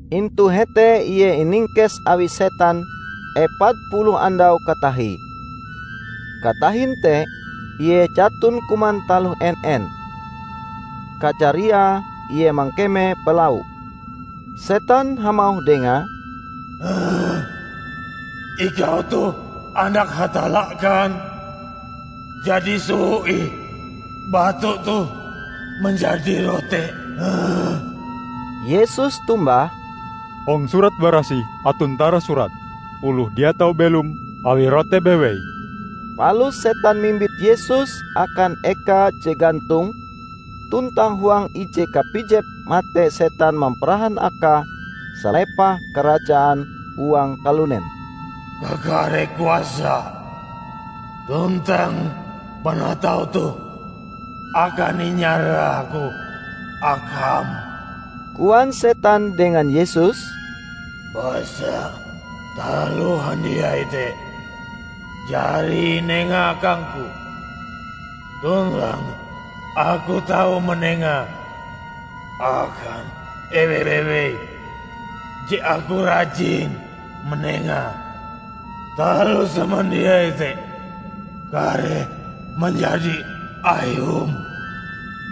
Intu hete Ie iningkes awi setan epat puluh andau katatahie. Katahin te, Ie jaton kuman taloh en-en. Kajariae Ie mangkeme balau. Setan hamauh Dengae, "Ikau toh Anak Hatalla kan? Jadi, soho ih batu toh manjadi rote." Yesus tombah, "Hong Surat Barasih aton tarasurat, 'Oloh dia tau belom awi rote bewei.' " Palus setan mimbit Yesus akan eka je gantong, tuntang huang ije kapijep mate setan mamparahan Akae salepah karajaan huang kalunen. "Kakare kuasa tuntang panatau toh akan inyarahku Akam," koan setan dengan Yesus, "basa taloh handiai te jari inenga akangku tuntang aku tau manengae akan eweh bewei je aku rajin manengae. Taloh samandiai te kareh manjadi Ayum,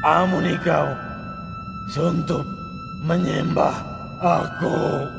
amon Ikau sontop manyembah aku."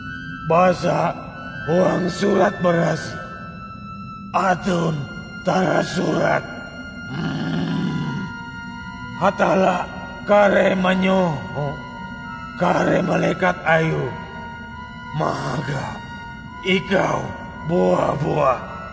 Basa huang Surat Barasih aton tarasurat, 'Hatalla kareh manyoho kare malekat Ayue mahaga Ikau bua-buah.'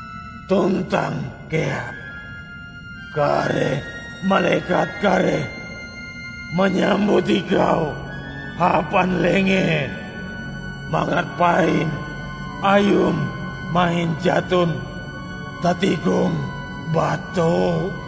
Tuntang kea, 'Kare malekat kareh manyambut Ikau hapan lengee, mangat pain Ayum mahin jaton tatigong batu.' "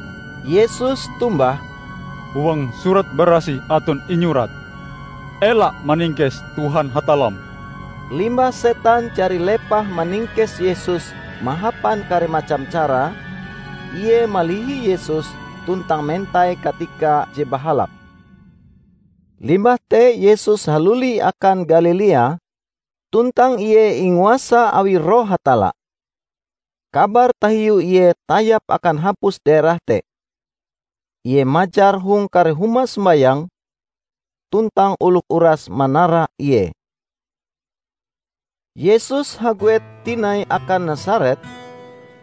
Yesus tombah, "Huang Surat Barasih aton inyurat, 'Ela maningkes Tuhan, Hatallam.' " Limbah setan jari lepah maningkes Yesus mahapan kare macam cara, ie malihi Yesus tuntang mentai katika je bahalap. Limbah te Yesus haluli akan Galilea tuntang Ie inguasa awi Roh Hatalla. Kabar tahiu Ie tayap akan hapus daerah te. Ie majar hong kare huma sombayang, tuntang oloh uras manara Ie. Yesus haguet tinai akan Nasaret,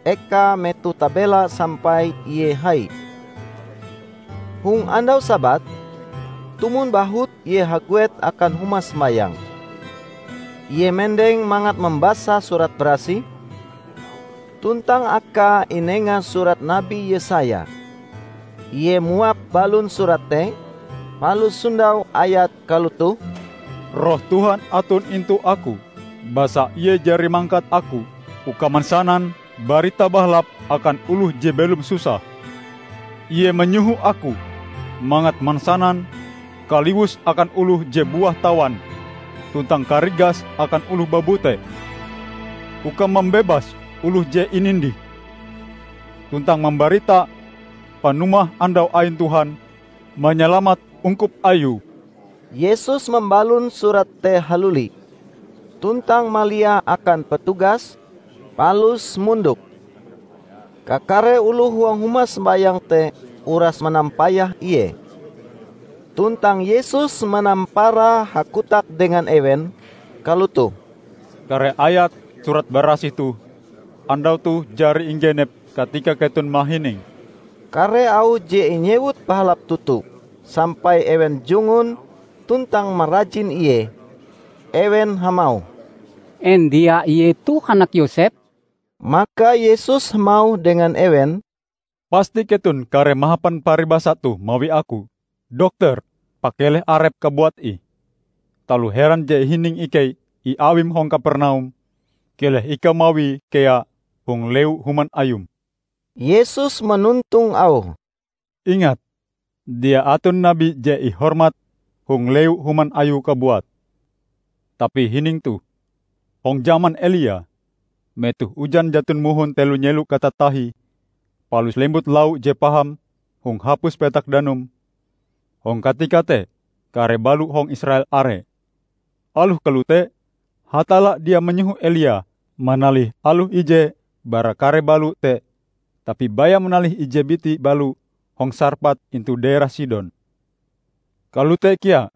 ekae metoh tabela sampai Ie hai. Hong andau Sabat, tumon bahut Ie haguet akan huma sombayang. Ie mendeng mangat mambasa Surat Barasih, tuntang akae inenga surat Nabi Yesaya. Ie muap balon surat te, palus sondaue ayat kalotoh, "Roh Tuhan aton intu Aku, basa Ie jari mangkat Aku uka mansanan Barita Bahalap akan oloh je belom susah. Ie manyoho Aku mangat mansanan kaliwus akan oloh je buah tawan tuntang karigas akan oloh babute; uka mambebas oloh je inindih tuntang mambarita panumah andau ain Tuhan manyalamat ungkup Ayue." Yesus mambalon surat te haluli, tuntang maliae akan petugas, palus mondok. Kakare oloh huang huma sombayang te uras manampayah Ie. Tuntang Yesus manampara hakotak dengan ewen, kalotoh, "Kare ayat Surat Barasih toh, andau toh jari inggenep katika keton mahininge." Kare auh je inyewute bahalap toto, sampai ewen jungun tuntang marajin Ie. Ewen hamauh, "En dia ie toh anak Yosep?" Maka Yesus hamauh dengan ewen, "Pasti keton kareh mahapan paribasa toh mawi Aku, 'Dokter, pakeleh Arepm kabuat ih. Taloh heran je ihining ikei iawim hong Kapernaum, keleh ikau mawie kea hong lewu human Ayum.' " Yesus manontong Auhe, "Ingat, dia aton nabi je ihormat hong lewu human Ayue kabuat. Tapi hining toh: hong jaman Elia, metoh ujan jaton mohon telo nyelo katatahie, palus lembut lau je paham hong hapus petak danum. Hong katika te kare balo hong Israel are. Aloh kalote, Hatalla dia manyoho Elia manalih aloh ije bara kare balo te tapi baya manalih ije biti balo hong Sarpat intu daerah Sidon. Kalote kea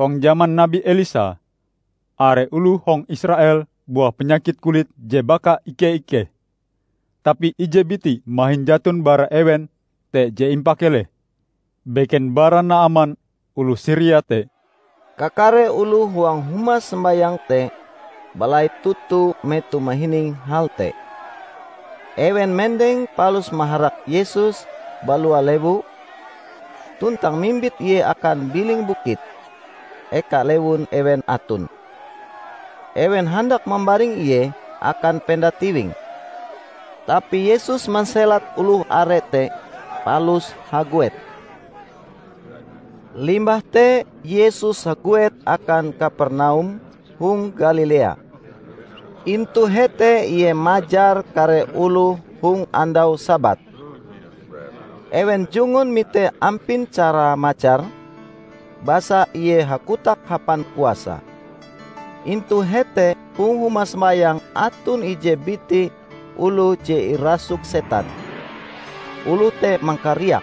hong jaman nabi Elisa are oloh hong Israel buah panyakit kulit je baka ike-ikeh, tapi ije biti mahin jaton bara ewen te je impakeleh, beken bara Naaman oloh Siria te." Kakare oloh huang huma sombayang te balait toto metoh mahining hal te. Ewen mendeng palus maharak Yesus balua lewu, tuntang mimbit Ie akan biling bukit, eka lewun ewen aton. Ewen handak mambaring Ie akan penda tiwing. Tapi Yesus manselat oloh are te palus haguet. Limbah te Yesus haguet akan Kapernaum hong Galilea. Intu hete Ie majar kare oloh hong andau Sabat. Ewen jungun mite ampin carae majar, basa Ie hakotak hapan kuasa. Intu hete hong huma sombayang aton ije biti oloh je irasuk setan. Oloh te mangkariak,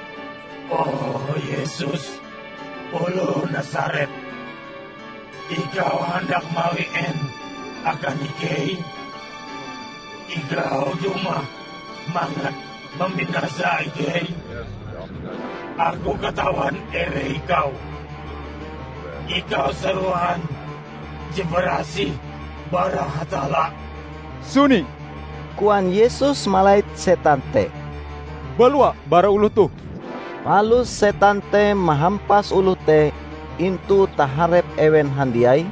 "O Yesus, oloh Nasaret, ikau handak mawi en akan ikei? Ikau dumah mangat mambinasa ikei? Aku katawan eweh Ikau: Ikau Sarohan je barasih bara Hatalla!" "Suni!" koan Yesus malait setan te. "Balua bara oloh toh!" Palus setan te mahampas oloh te intu taharep ewen handiai,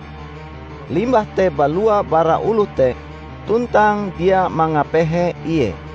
limbah te balua bara oloh te tuntang dia mangapehe ie.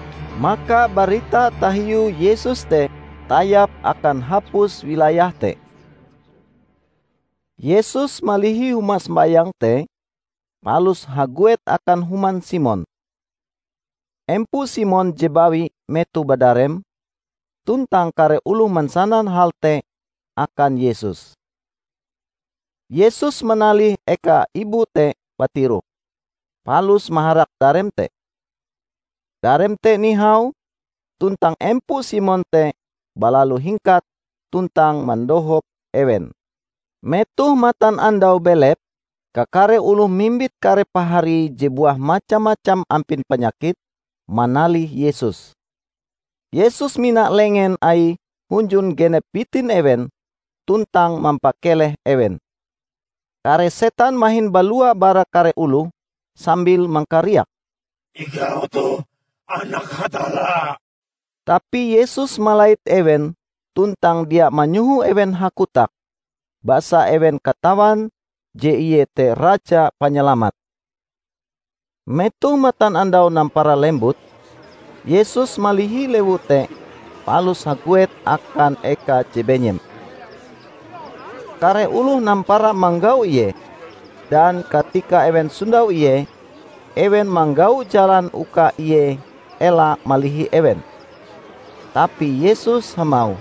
Maka barita tahiu Yesus te tayap akan hapus wilayah te. Yesus malihi huma sombayang te, palus haguet akan human Simon. Empo Simon je bawi metoh badarem, tuntang kare oloh mansanan hal te akan Yesus. Yesus manalih eka ibu te batiroh, palus maharak darem te. Darem te nihau, tuntang empo Simon te balalu hingkat tuntang mandohop ewen. Metoh matanandau belep, kakare oloh mimbit kare paharie je buah macam-macam ampin panyakit, manalih Yesus. Yesus mina lengen Aie hunjun genep bitin ewen tuntang mampakeleh ewen. Kare setan mahin balua bara kare oloh, sambil mangkariak, "Ikau toh anak Hatalla!" Tapi Yesus malait ewen tuntang dia manyoho ewen hakotak, basa ewen katawan je Ie te Raja Panyalamat. Metoh matanandau nampara lembut, Yesus malihi lewu te palus haguet akan eka je benyem. Kare oloh nampara manggau Ie, dan katika ewen sondau Ie, ewen manggau jalan uka Ie ela malihi ewen. Tapi Yesus hamauh,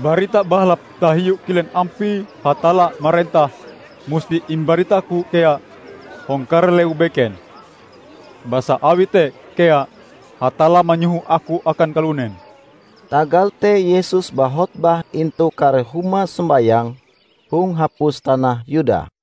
"Barita Bahalap tahiu kilen ampie Hatalla marentah musti imbarita-Ku kea hong kare lewu beken, basa awi te kea Hatalla manyoho Aku akan kalunen." Tagal te Yesus bahotbah intu kare huma sombayang hong hapus tanah Yuda.